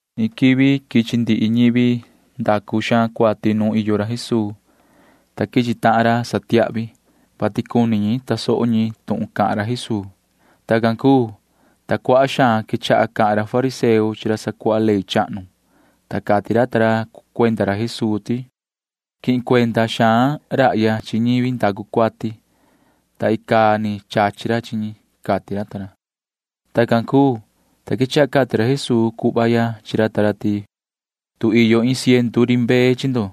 Iin quivi quichi ndihi ñivi ndacu xaan cuati nuun iyo ra Jesuu, ta quichi tahan ra satiahvi, vati cuni ñi tasoho ñi tuhun cahan ra Jesuu. Tacan cuu, ta cuaha xaan quechaha cahan ra fariseo chi ra sacuaha ley chahnu, ta cati ra ta ra cuenda ra Jesuu ti: ―Quihin cuenda xaan rahya chi ñivi ndacu cuati, ta icaa ni chachi ra chi ñi ―cati ra ta ra. Tacan cuu, ta quechaha cati ra Jesuu cuhva ya chi ra ta ra ti: ―Tu iyo iin ciendu ri mbee chi ndo,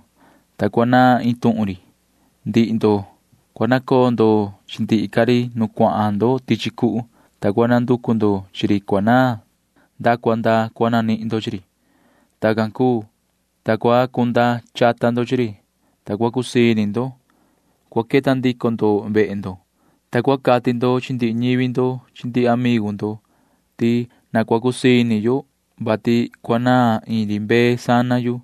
ta cuanaan iin tuhun ri, ndihi ndo―cua nacoo ndo chi ndihi ca ri nu cuahan ndo tichi cuhu, ta cua nanducu ndo chi ri cuanaan nda cua nda cua nanihin ndo chi ri. Tacan cuu, ta cua cunda chata ndo chi ri, ta cua cusii ini ndo. Cua queta ndico ndo vehe ndo, ta cua cati ndo chi ndihi ñivi ndo chi ndihi amigu ndo ti: “Na cua cusii ini yo, vati cuanaan iin ri mbee sana yu,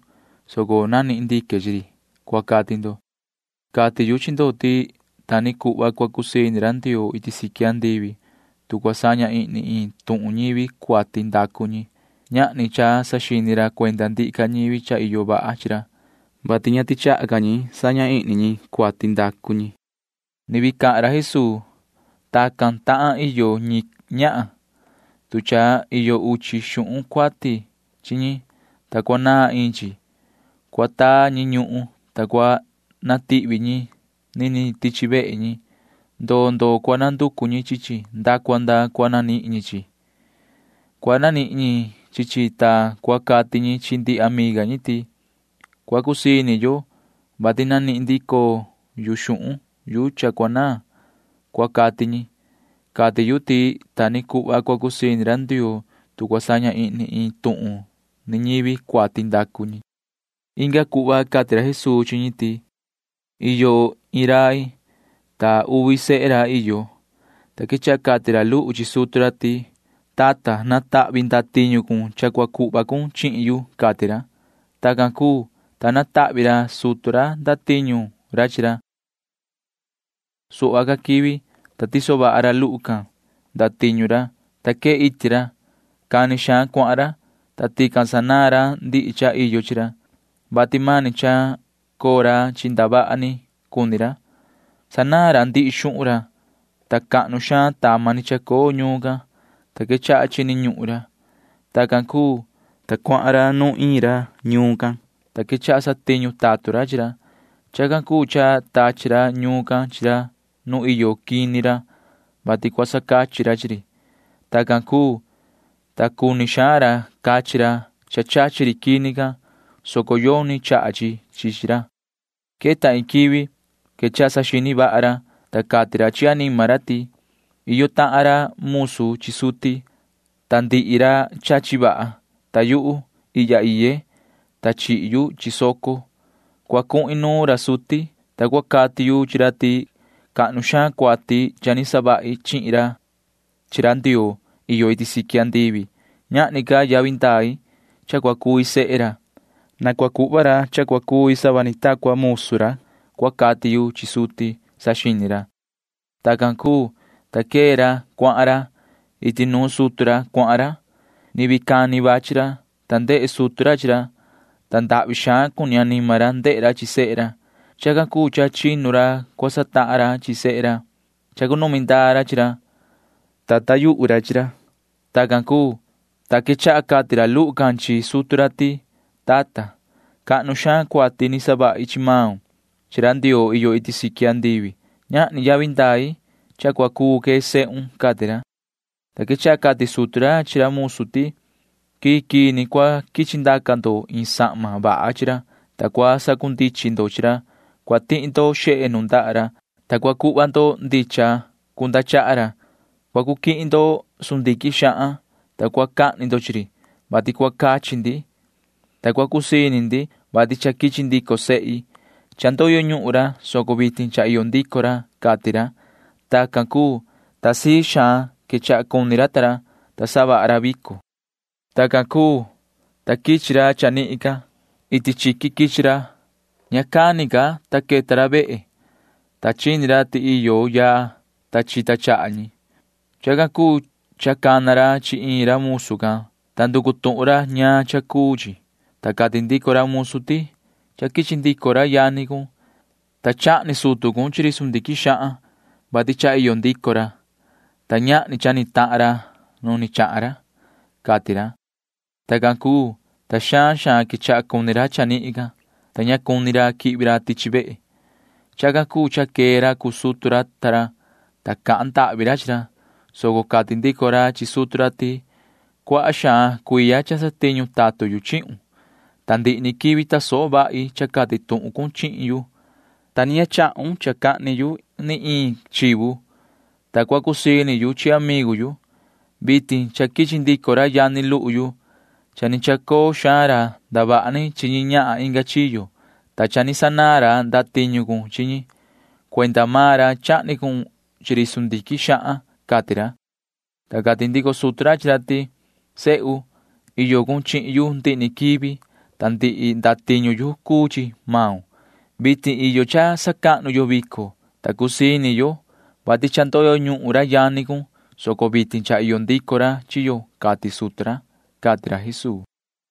soco nanihin ndique chi ri,” cua cati ndo. Cati yu chi ndo ti ta ni cuhva cua cusii ini ra Ndioo iti siqui andivi, tu cua saña ihni iin tuhun ñivi cuati ndacu ñi. Ñahni cha saxini ra cuenda ndihi ca ñivi cha iyo vaha chi ra, [vati ña tichaha ca ñi saña ihni ñi cuati ndacu ñi]. [Ni vii cahan ra Jesuu:] ’Tacan tahan iyo ñi ñahan. Tu cha iyo uchi xuhun cuati chi ñi, ta cuanaan iin chi, cua taa ñi ñuhun, ta cua natihvi ñi niniin tichi vehe ñi. Ndoo ndoo cua nanducu ñi chi chi nda cua nda cua nanihin ñi chi chi. Cua nanihin ñi chi chi, ta cua cati ñi chi ndihi amiga ñi ti: “Cua cusii ini yo, vati nanihin ndico yu xuhun yu cha cuanaan,” cua cati ñi. Cati yu ti ta ni cuhva cua cusii ini ra tatun Ndioo, tu cua saña ihni iin tuhun ni ñivi cuati ndacu ñi. Inga cuhva cati ra Jesuu chi ñi ti: ―Iyo iin rai, ta uvi sehe ra iyo, ta quechaha cati ra luhu chi sutu ra ti: “Tata, natahvi ndatiñu cun cha cua cuhva cun chihin yu,” cati ra. Tacan cuu, ta natahvi ra sutu ra ndatiñu ra chi ra. Suhva ca quivi, ta tiso vaha ra luhu can ndatiñu ra, ta quee iti ra. Cani xaan cuahan ra, ta tican sanaan ra ndihi cha iyo chi ra, vati mani cha coo ra chi ndavaha ni cuni ra. Sanaan ra ndihi xuhun ra, ta cahnu xaan tama ni chacoo ñuun can, ta quechaha chini ñuhun ra. Tacan cuu, ta cuahan ra nuun iin ra ñuun can, ta quechaha satiñu tatun ra chi ra. Chacan cuu cha tachi ra ñuun can chi ra nu iyo quini ra, vati cua sacachi ra chi ri. Tacan cuu, ta cuni xaan ra cachi ra cha chachi ri quini can, soco yoni chaha chi chi chi ra. Queta iin quivi quechaha saxini vaha ra, ta cati ra chi anima ra ti: “Iyo tahan ra musu chi suti, ta ndihi ra chachi vaha, ta yuhu―ihya iye, ta chihi yu chi soco. Cua cuhin nuun ra suti, ta cua cati yu chi ra ti cahnu xaan cuati cha ni savahi chihin ra chi ra Ndioo iyo iti siqui andivi. Ñahni ca yavi ndai cha cua cui sehe ra. Na cua cuhva ra cha cua cui sava ni ta cuhva iin musu ra, cua cati yu chi suti,” saxini ra. Tacan cuu, ta quee ra cuahan ra. Iti nuun sutu ra cuahan ra. ’Ni vii cani vachi ra, ta ndehe sutu ra chi ra, ta ndahvi xaan cuni anima ra ndehe ra chi sehe ra. Chacan cuu cha chinu ra cua satahan ra chi ra. Chacunumi ndaa ra chi ra, ta chihi ra yuhu ra. Tacan cuu, ta quechaha cati ra luhu can chi sutu ra ti: “Tata, cahnu xaan cuati ni savahi chi maun chi ra Ndioo iyo iti siqui andivi. Ñahni yavi ndai cha cua cuu que sehun,” cati ra, ta quechaha cati sutu ra chi ra musu ti: “Quii quii ni cua quichi ndaca ndo iin sahma vaha chi ra, ta cua sacundichin ndo chi ra. Cua tihi ndo xehe nundaha ra, ta cua cuhva ndo ndichan cunda chaha ra. Cua cu quihin ndo sundiquin xahan, ta cua cahni ndo chi ri, vati cua cachi ndi, ta cua cusii ini ndi, vati cha quichi ndico sehi. Cha ndoyo ñuhun ra, soco vitin cha iyo ndico ra,” cati ra. Tacan cuu, ta sii xaan quechaha cuni ra ta ra, ta savaha ra vico. ’Tacan cuu, ta quichi ra chanihin ca. Iti chiqui quichi ra. Ña cani ca, ta queta ra vehe, ta chini ra ti iyo yaa, ta chita chaha ñi. Chacan cuu cha cana ra chi iin ra musu can, ta nducu tuhun ra ñaan cha cuu chi, ta cati ndico ra musu ti: “Cha quichi ndico ra yani cun, ta chahni sutu cun chi ri sundiquin xahan, vati cha iyo ndico ra, ta ñahni cha ni tahan ra nu ni chahan ra,” cati ra. Tacan cuu, ta xaan xaan quechaha cuni ra chanihin can, ta ña cuni ra quihvi ra tichi vehe. Chacan cuu cha quee ra cuu sutu ra ta ra, ta cahan ndahvi ra chi ra, soco cati ndico ra chi sutu ra ti: “Cuaha xaan cuiya cha satiñu tatun yu chihun, ta ndihi ni quivi tasoho vahi cha cati tuhun cun chihin yu, ta ña ni chahun cha cahni yu ni iin chivu, ta cua cusii ini yu chi amigu yu. Vitin cha quichi ndico ra yani luhu yu. Cha ni chacoo xaan ra ndavaha ni chi ñi ñahan inga chiyo, ta cha ni sanaan ra ndatiñu cun chi ñi. Cuenda maan ra chahni cun chi ri sundiquin xahan,” cati ra, ta cati ndico sutu ra chi ra ti: “Sehu, iyo cun chihin yu ndihi ni quivi, ta ndihi ndatiñu yu cuu chi maun. Vitin iyo cha sacahnu yo vico, ta cusii ini yo, vati cha ndoyo ñuhun ra yani cun, soco vitin cha iyo ndico ra chi yo,” cati sutu ra ―cati ra Jesuu.